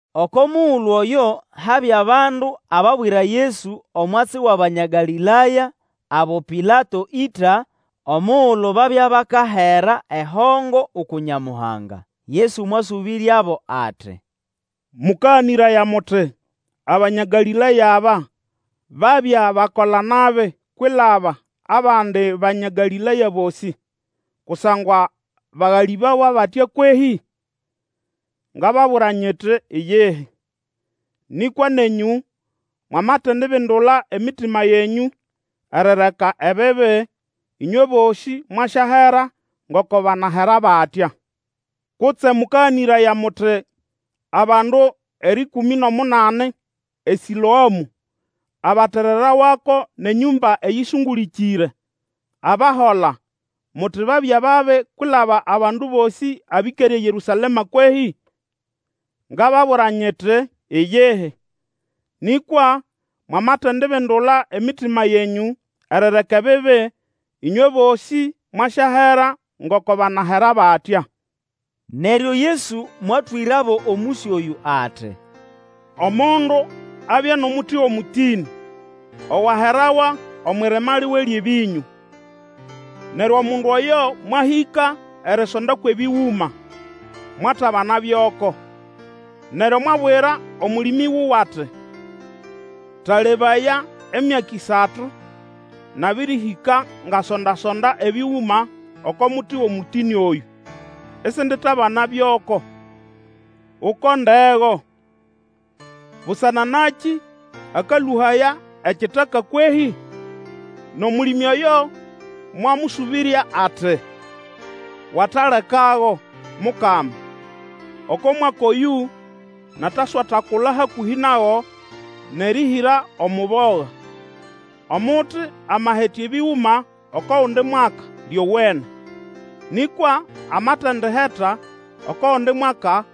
Oko mugulu oyo habya bandu ababwira Yesu omwatsi wʼAbanya Galĩlaya abo Pilato ĩta omugulu babya bakahera ehongo uku Nyamuhanga. Yesu mwasũbĩryabo ati, Mũkaganĩraya muti Abanya Galĩlaya aba babya bakola-nabi kwilaba abandi Banya Galĩlaya bosĩ, kusangwa bagalĩbawa batya kwehĩ? Ngababwira nyiti, Iyihi! Nĩkwa nenyũ, mwamatendibindula emitima yenyũ erireka ebibi, ĩnywe bosĩ mwasyahera ngoko banahera batya. Kutse mũkaganĩraya muti abandu erĩkũmĩ nʼomunani eSĩloamũ abatererawako nʼenyũmba eyĩsũngũlĩkĩre, abahola, muti babya babi kwilaba abandu bosĩ abĩkere eYerũsalema kwehĩ? Ngababwira nyiti, Iyihi! Nĩkwa mwamatendibindula emitima yenyũ erireka ebibi, ĩnywe bosĩ mwasyahera ngoko banahera batya. Neryo Yesu mwatwĩrabo omũsyo oyũ ati, Omundu abya nʼomuti wʼomũtĩnĩ owaherawa omwʼirima liwe lyʼebĩnyũ. Neryo omundu oyo mwahĩka erisonda kwʼebĩgũma, mwatabana byoko. Neryo mwabwira Omũlĩmĩ wuwe ati, Talebaya, emyaka ĩsatu nabĩrĩhĩka ngasonda-sonda ebĩgũma oko muti wʼomũtĩnĩ oyũ isinditabana byoko. Ukondego! Busana nakĩ akalũhaya ekitaka kwehĩ? Nʼomũlĩmĩ oyo mwamũsũbĩrya ati, Watalekago, Mukama, oko mwaka oyũ nataswatakula hakũhĩ nago nʼerĩhĩra omuboga. Omuti amahetya ebĩgũma oko gundi mwaka, lyowene. Nĩkwa amatendiheta oko gundi mwaka,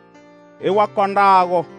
iwakondago.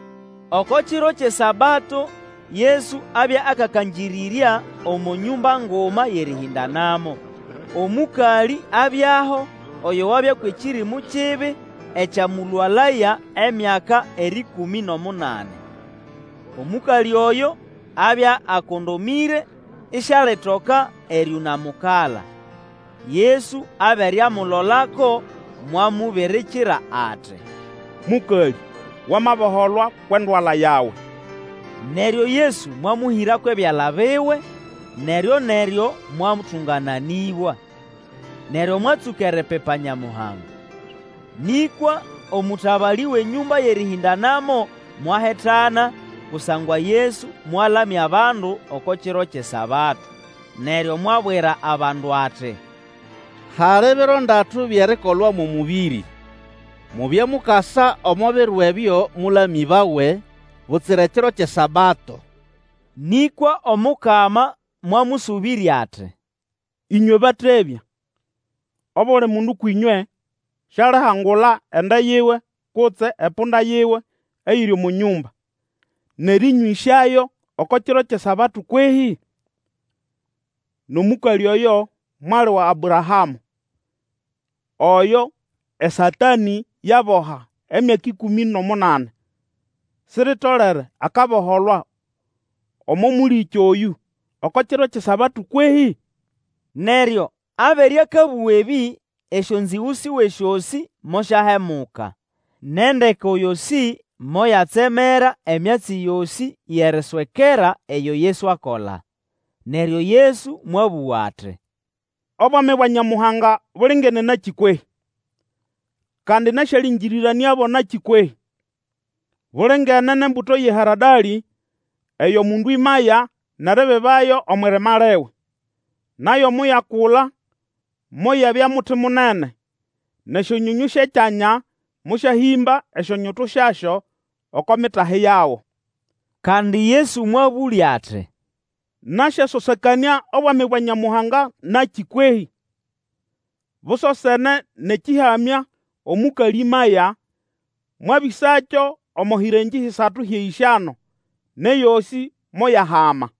Oko kiro kyʼeSabato Yesu abya akakangĩrĩrya omo nyũmba nguma yʼerĩhĩndanamo. Omũkalĩ abyaho oyo wabya kwʼekĩrĩmũ kibi ekyamũlwalaya emyaka erĩkũmĩ nʼomunani. Omũkalĩ oyo abya akondomĩre isialitoka erĩũnamukala. Yesu abere amulolako, mwamubirikira ati, Mũkalĩ, wamaboholwa kwʼendwala yawe! Neryo Yesu mwamũhĩra kwʼebyala biwe; neryo-neryo mwatũngananĩbwa, neryo mwatsũka eripipa Nyamuhanga. Nĩkwa omũtabalĩ wʼenyũmba yʼerĩhĩndanamo mwahitana, kusangwa Yesu mwalamya abandu oko kiro kyʼeSabato, neryo mwabwira abandu ati, Hali biro ndatu byʼerikolwamo omũbĩrĩ; mubye mukasa omo biro ebyo mũlamĩbawe, butsira ekiro kyʼeSabato! Nĩkwa Omukama mwamũsũbĩrya ati, Ĩnywe batebya! Obuli mundu kwĩnywe sialihangula ende yiwe kutse epunda yiwe eyiri omo nyũmba, nʼerĩnywĩsyayo oko kiro kyʼeSabato kwehĩ? Nʼomũkalĩ oyo, mwali wa Abrahamũ, oyo eSatanĩ yaboha emyaka erĩkũmĩ nʼomunani, siritolere akaboholwa omo mũlĩkĩ oyũ, oko kiro kyʼeSabato kwehĩ? Neryo abere akabũga ebĩ, esyonzĩgũ siwe syosĩ mosyahemuka; nʼendeko yosĩ moyatsemera emyatsi yosĩ yʼeriswekera eyo Yesu akola. Neryo Yesu mwabũga ati, Obwami bwa Nyamuhanga bulingene nakĩ kwehĩ? Kandi nasyalĩngĩrĩranĩabo nakĩ kwehĩ? Bulingene nʼembuto yʼeharadalĩ eyo mundu ĩmaya nʼeribibayo omwʼirima liwe; nayo moyakula moyabya muti munene, nʼesyonyonyũ syʼekyanya mosyahĩmba esyonyutu syasyo oko mitahi yago. Kandi Yesu mwabũlya ati, Nasyasosekanĩa Obwami bwa Nyamuhanga nakĩ kwehĩ? Busosene nʼekĩhamya omũkalĩ ĩmaya; mwabĩsakyo omo hĩrengĩ hisatu hyʼeyĩsyano, nʼeyosĩ moyahama.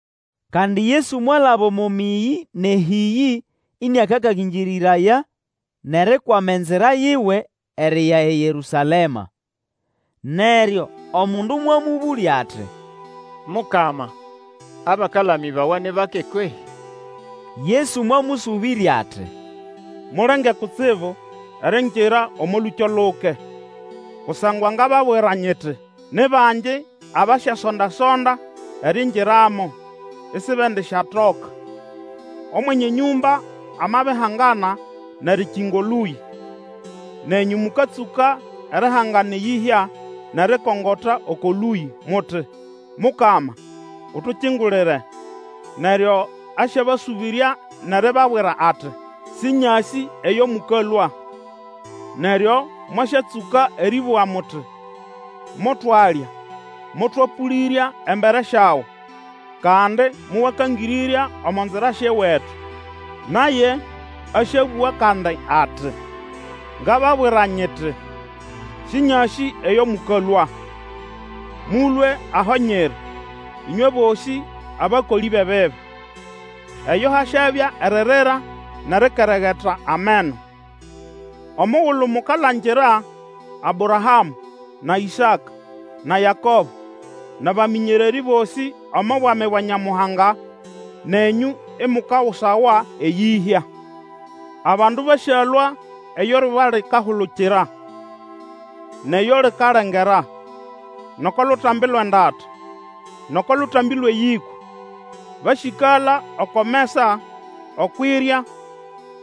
Kandi Yesu mwalaba omo mĩyĩ nʼehĩyĩ, ĩnĩakakangĩrĩraya, nʼerikwama enzira yiwe eriya eYerũsalema. Neryo omundu mwamũbũlya ati, Mukama, abakalamĩbawa ni bake kwehĩ? Yesu mwamũsũbĩrya ati, Mulenge kutsibu eriingira omo lũkyo luke, kusangwa ngababwira nyiti, Ni bangi abasyasondasonda eriingiramo, isibendisyatoka. Omwenye enyũmba amabihangana nʼerikinga Olũyĩ, nenyũ mũkatsũka erihangana eyĩhya nʼerikongota oko lũyĩ, muti, Mukama, utukingulire! Neryo asyabasũbĩrya nʼeribabwira ati, Sĩnyasĩ eyo mũkalũa. Neryo mwasyatsũka erĩbũga muti, motwalya, motwapũlĩrya embere syawe; kandi mowakangĩrĩrya omo nzira syʼewetu. Naye asyabũga kandi ati, Ngababwira nyiti, Sĩnyasĩ eyo mũkalũa. Mũlũe aho nyiri, ĩnywe bosĩ abakolĩ bʼebibi! Eyo hasyabya eririra nʼerikeregeta ameno, omugulu mukalangira Abrahamũ na Ĩsaka, na Yakobo, nʼabamĩnyererĩ bosĩ omo Bwami bwa Nyamuhanga, nenyũ imukagusawa eyĩhya. Abandu basyalũa eyo eryuba likahulukira, nʼeyo likalengera, nʼoko Lutambi lwʼeNdata, nʼoko Lutambi lwʼeYĩkwa, basyĩkala oko mesa okwʼirya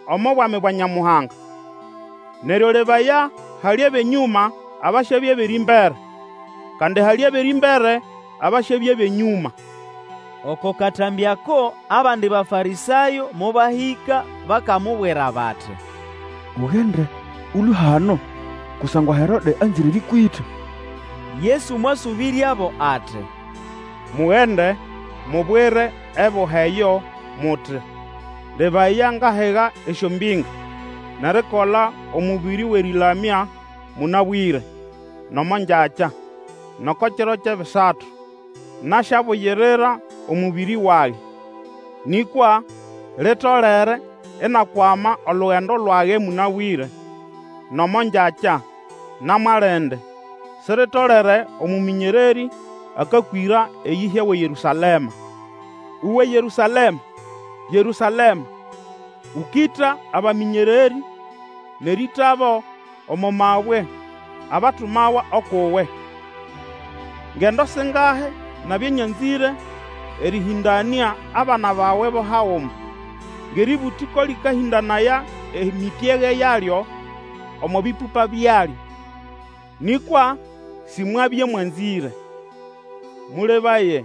omo Bwami bwa Nyamuhanga. Neryo lebaya, hali bʼenyũma abasyabya bʼerĩmbere, kandi hali abʼerĩmbere abasyabya bʼenyũma. Oko katambĩ ako, abandi Bafarĩsayo mobahĩka bakamubwira bati, Ugende, Ũlũe hano, kusangwa Herode anzĩre erĩkwĩta. Yesu mwasũbĩryabo ati, Mugende mubwire eboha eyo muti, Lebaya, ngahiga esyombĩnga nʼerikola omũbĩrĩ wʼerĩlamya mũnabwĩre nʼomo ngyakya, nʼoko kiro kyʼebisatu nasyabugirira omũbĩrĩ wage. Nĩkwa litolere inakwama olugendo lwage mũnabwĩre, nʼomo ngyakya, na mwalindi; siritolere omũmĩnyererĩ akakwĩra eyĩhya wʼeYerũsalema. Uwe Yerũsalema, Yerũsalema! Ũkĩta abamĩnyererĩ nʼerĩĩtabo omo mabwe abatumawa ukʼuwe! Ngendo singahi nabya nyanzĩre erĩhĩndanĩa abana bawe bo haguma, ngʼerĩbũtĩ ko lĩkahĩndanaya emĩpyege yalyo omo bĩpũpa byalyo, nĩkwa Simwabya mwanzĩre! Mũlebaye,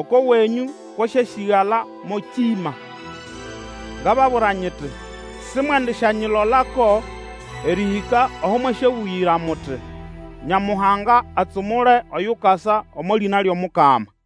oko wenyũ kwasyasĩgala mo kĩma. Ngababwira nyiti, Simwendisyanyilolako erĩhĩka aho mwasyabũgĩra muti, Nyamuhanga atsumule oyukasa omo lĩna lyʼomukama!